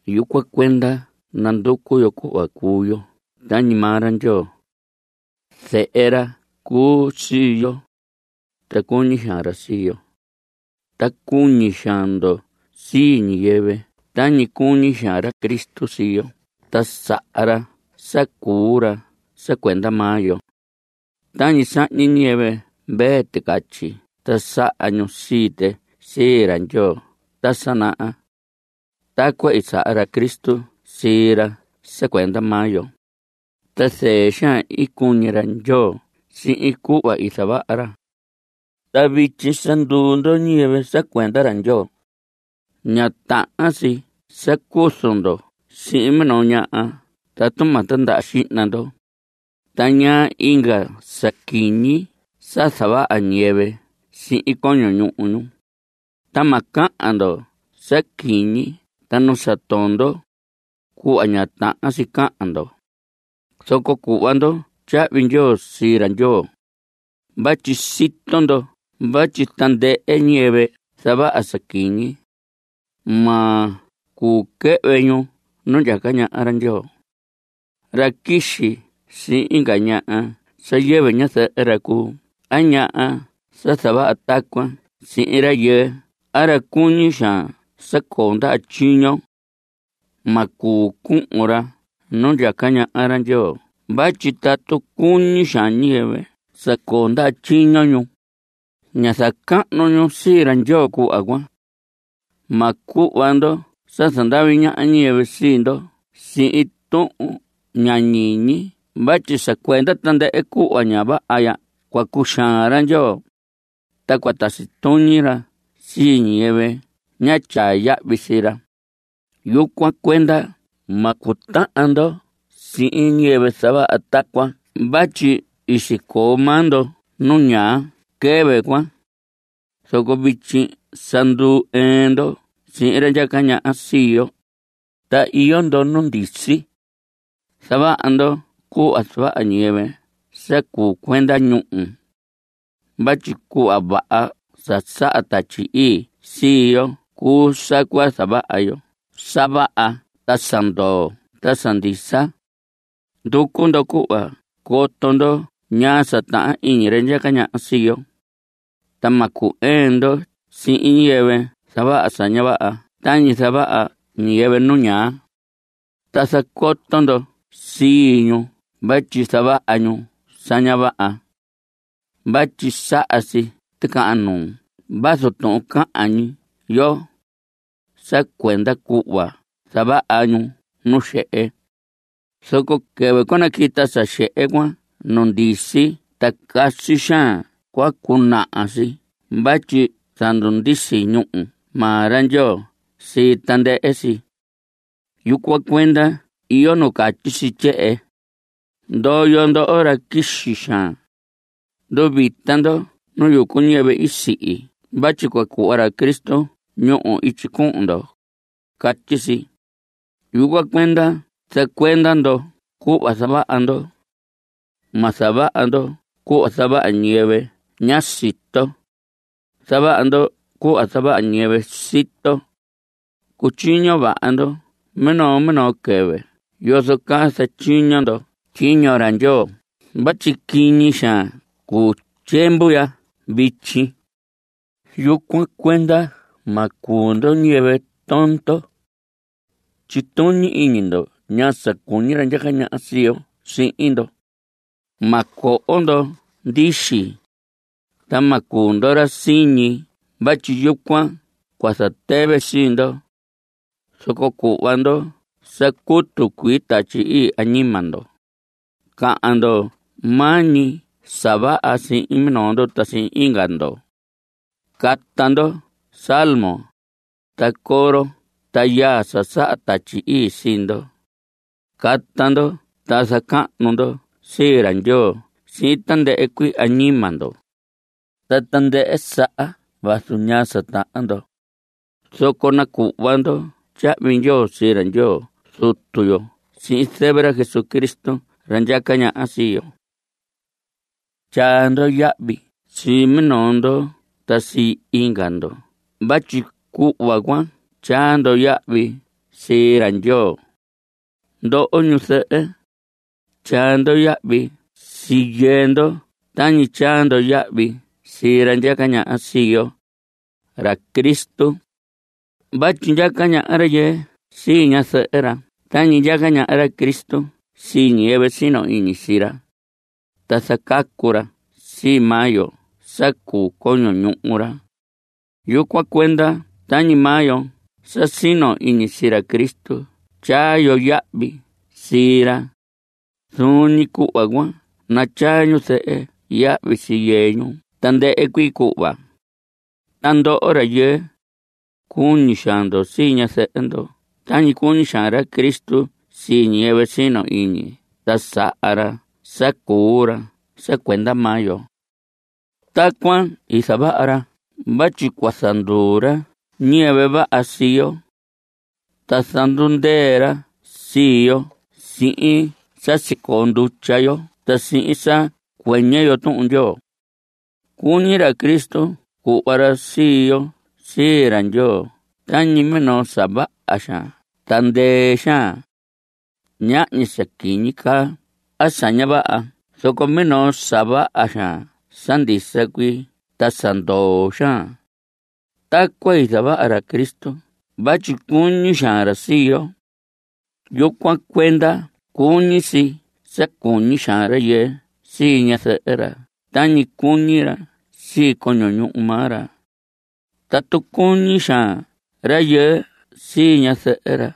Yucuan cuenda nanducu yo cuhva cuu yo tañi maa ra Ndyoo. Zehe ra cuu sii yo, ta cuñi xaan ra sii yo. Ta cuñi xaan ndo sii ñiyɨvɨ tañi cuñi xaan ra Cristo sii yo ta saha ra sa cuu ra sa cuenda maa yo. Tañi sahñi ñiyɨvɨ mvee ticatyi ta saha ñu sii tɨ sii ra Ndyoo ta sa naha, tacuan i saha ra Cristo sii ra sa cuenda maa yo. Ta zɨɨ xaan i cuñi ra Ndyoo sihin cuhva i zavaha ra. Ta vityi sa nduu ndo ñiyɨvɨ sa cuenda ra Ndyoo, ña tahan si sa cuzu ndo sihin minoo ñaha tatu ma tindaha xihna ndo, ta ñaa inga sa quiñi sa zavaha ñiyɨvɨ sihin coño ñuhu ñu. Ta ma cahan ndo sa quiñi ta nu sa tondo, cuhva ña tahan si cahan ndo. Zoco cuhva ndo tyahvi ndyoo sii ra Ndyoo. Vatyi sito ndo vatyi tandɨhɨ ñiyɨvɨ zavaha sa quiñi, ma cuu quɨhvɨ ñu nu ndyaca ñaha ra Ndyoo. Ra quixi sihin inga ñaha sa yɨvɨ ñazɨhɨ ra cuu a ñaha sa zavaha tacuan sihin rayɨɨ a ra cuñi xaan sa coo ndaha tyiño, ma cuu cuhun ra nu ndyaca ñaha ra Ndyoo vatyi tatu cuñi xaan ñiyɨvɨ sa coo ndaha tyiño ñu, ña zacahnu ñu sii ra Ndyoo cuhva cuan. Ma cuhva ndo sa zandavi ñaha ñiyɨvɨ sii ndo sihin tuhun ña ñiñi vatyi sa cuenda tandɨhɨ cuhva ña vaha ya cua cuxaan ra Ndyoo, ta cua tasi tuñi ra sii ñiyɨvɨ ña tyaa yahvi sii ra. Yucuan cuenda ma cutahan ndo sihin ñiyɨvɨ zavaha tacuan vatyi i sicoo maa ndo nu ñaa quɨvɨ cuan. Zoco vityi sa ndu‑ɨɨn ndo sihin ra ndyaca ñaha sii yo, ta iyo ndo nu ndisi. Zavaha ndo cuhva zavaha ñiyɨvɨ sa cuu cuenda ñúhu. Vatyi cuhva vaha sa saha Tatyi Ii sii yo cuu sa cua zavaha yo sa vaha ta sa ndoo ta sa ndisa. Nducu ndo cuhva coto ndo ñaa sa tahan iñi ra ndyaca ñaha sii yo. Ta ma cu‑ɨɨn ndo sihin ñiyɨvɨ zavaha sa ña vaha tañi zavaha ñiyɨvɨ nu ñaa. Ta zacoto ndo sii ñu vatyi zavaha ñu sa ña vaha. Vatyi saha si ticahan nuu vazu tuhun cahan ñi yo, sa cuenda cuhva zavaha ñu nu xehe. Zoco quɨvɨ cua naquita sa xehe cuan nu ndisi ta casi xaan cua cunaha si vatyi zandundisi ñúhu maa ra Ndyoo sii tandɨhɨ si. Yucuan cuenda iyo nu catyi si tyehen: Ndoyo ndoho ra quixi xaan. Nduvita ndo nu yucu ñiyɨvɨ i sihi vatyi cua cuhva ra Cristo ñúhu ityi cuhun ndo. Catyi si. Yucuan cuenda zacuenda ndo cuhva zavaha ndo. Ma zavaha ndo cuhva zavaha ñiyɨvɨ ña sito. Zavaha ndo cuhva zavaha ñiyɨvɨ sito. Cutyiño vaha ndo minoo minoo quɨvɨ yozo caa zatyiño ndo tyiño ra Ndyoo vatyi quiñi xaan cuu tyiemvu ya vityi. Yucuan cuenda ma cuu ndo ñiyɨvɨ tondo; tyituñi iñi ndo ñaa sa cuñi ra ndyaca ñaha sii yo sihin ndo. Ma coho ndo ndixi, ta ma cuu ndo ra siñi vatyi yucuan cua zatɨvɨ sii ndo. Zoco cuhva ndo sa cutu cuii Tatyi Ii añima ndo. Cahan ndo maa ñi sa vaha sihin minoo ndo ta sihin inga ndo. Cata ndo salmos, ta coro ta yaa sa saha Tatyi Ii sii ndo. Cata ndo ta zacahnu ndo sii ra Ndyoo sihin tandɨhɨ cuii añima ndo. Ta tandɨhɨ saha vazu ñaa sa tahan ndo, zoco nacuhva ndo tyahvi ndyoo sii ra Ndyoo Zutu yo sihin zɨvɨ ra Jesucristo, ra ndyaca ñaha sii yo. Tyaa ndo yahvi sii minoo ndo ta sii inga ndo vatyi cuhva cuan tyaa ndo yahvi sii ra Ndyoo. Ndoho ñuzɨhɨ, tyaa ndo yahvi sii yɨɨ ndo tañi tyaa ndo yahvi sii ra ndyaca ñaha sii yo, ra Cristo. Vatyi ndyaca ñaha rayɨɨ sii ñazɨhɨ ra tañi ndyaca ñaha ra Cristo sii ñiyɨvɨ sino iñi sii ra. Ta zacacu ra sii maa yo sa cuu coño ñuhu ra. Yucuan cuenda tañi maa yo sa sino iñi sii ra Cristo tyaa yo yahvi sii ra, zuun ñi cuhva cuan natyaa ñuzɨhɨ yahvi sii yɨɨ ñu tandɨhɨ cuii cuhva. Ta ndoho rayɨɨ, cuñi xaan ndo sii ñazɨhɨ ndo tañi cuñi xaan ra Cristo sii ñiyɨvɨ sino iñi ta saha ra sa cuu ra sa cuenda maa yo. Tacuan i zavaha ra vatyi cua zanduu ra ñiyɨvɨ vaha sii yo. Ta zandundɨɨ ra sii yo sihin sa sicoo ndutya yo ta sihin sa cuɨñɨ yo Tuhun Ndyoo. Cuñi ra Cristo cuhva ra sii yo sii ra Ndyoo tañi minoo sa vaha xaan ta ndɨɨ xaan, ñahñi sa quiñi caa a sa ña vaha zoco minoo sa vaha xaan sa ndisa cuii ta sa ndoo xaan. Tacuan i zavaha ra Cristo vatyi cuñi xaan ra sii yo; yucuan cuenda cuñi si sa cuñi xaan rayɨɨ sii ñazɨhɨ ra tañi cuñi ra sii coño ñuhu maa ra. Tatu cuñi xaan rayɨɨ sii ñazɨhɨ ra,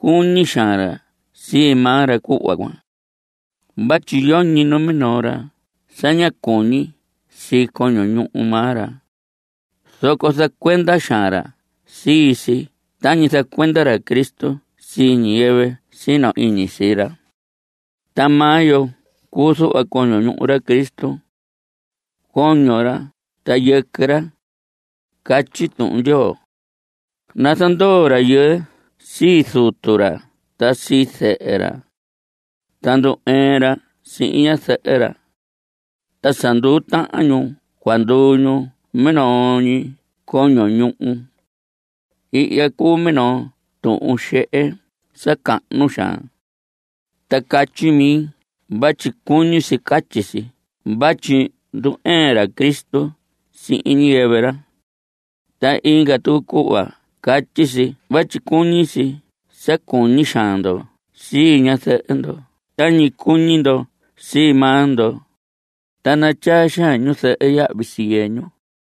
cuñi xaan ra sii maa ra cuhva cuan. Vatyi yoñi numinoo ra sa ña cuñi sii coño ñuhu maa ra, zoco zacuenda xaan ra sii si tañi zacuenda ra Cristo sii ñiyɨvɨ sino iñi sii ra. Ta maa yo cuu zuhva coño ñuhu ra Cristo, coño ra ta yɨquɨ ra. Catyi Tuhun Ndyoo: “Nazandoo rayɨɨ sii zutu ra ta sii zɨhɨ ra, ta nandu‑ɨɨn ra sihin ñazɨhɨ ra. Ta sa nduu tahan ñu cua nduu ñu minoo ñi coño ñuhu.” Ihya cuu minoo tuhun xehe sa cahnu xaan. Ta catyi mi vatyi cuñi si catyi si vatyi ndu‑ɨɨn ra Cristo sihin ñiyɨvɨ ra. Ta inga tucu cuhva catyi si vatyi cuñi si sa cuñi xaan ndo sii ñazɨhɨ ndo tañi cuñi ndo sii maa ndo, ta natyaa xaan ñuzɨhɨ yahvi sii yɨɨ ñu.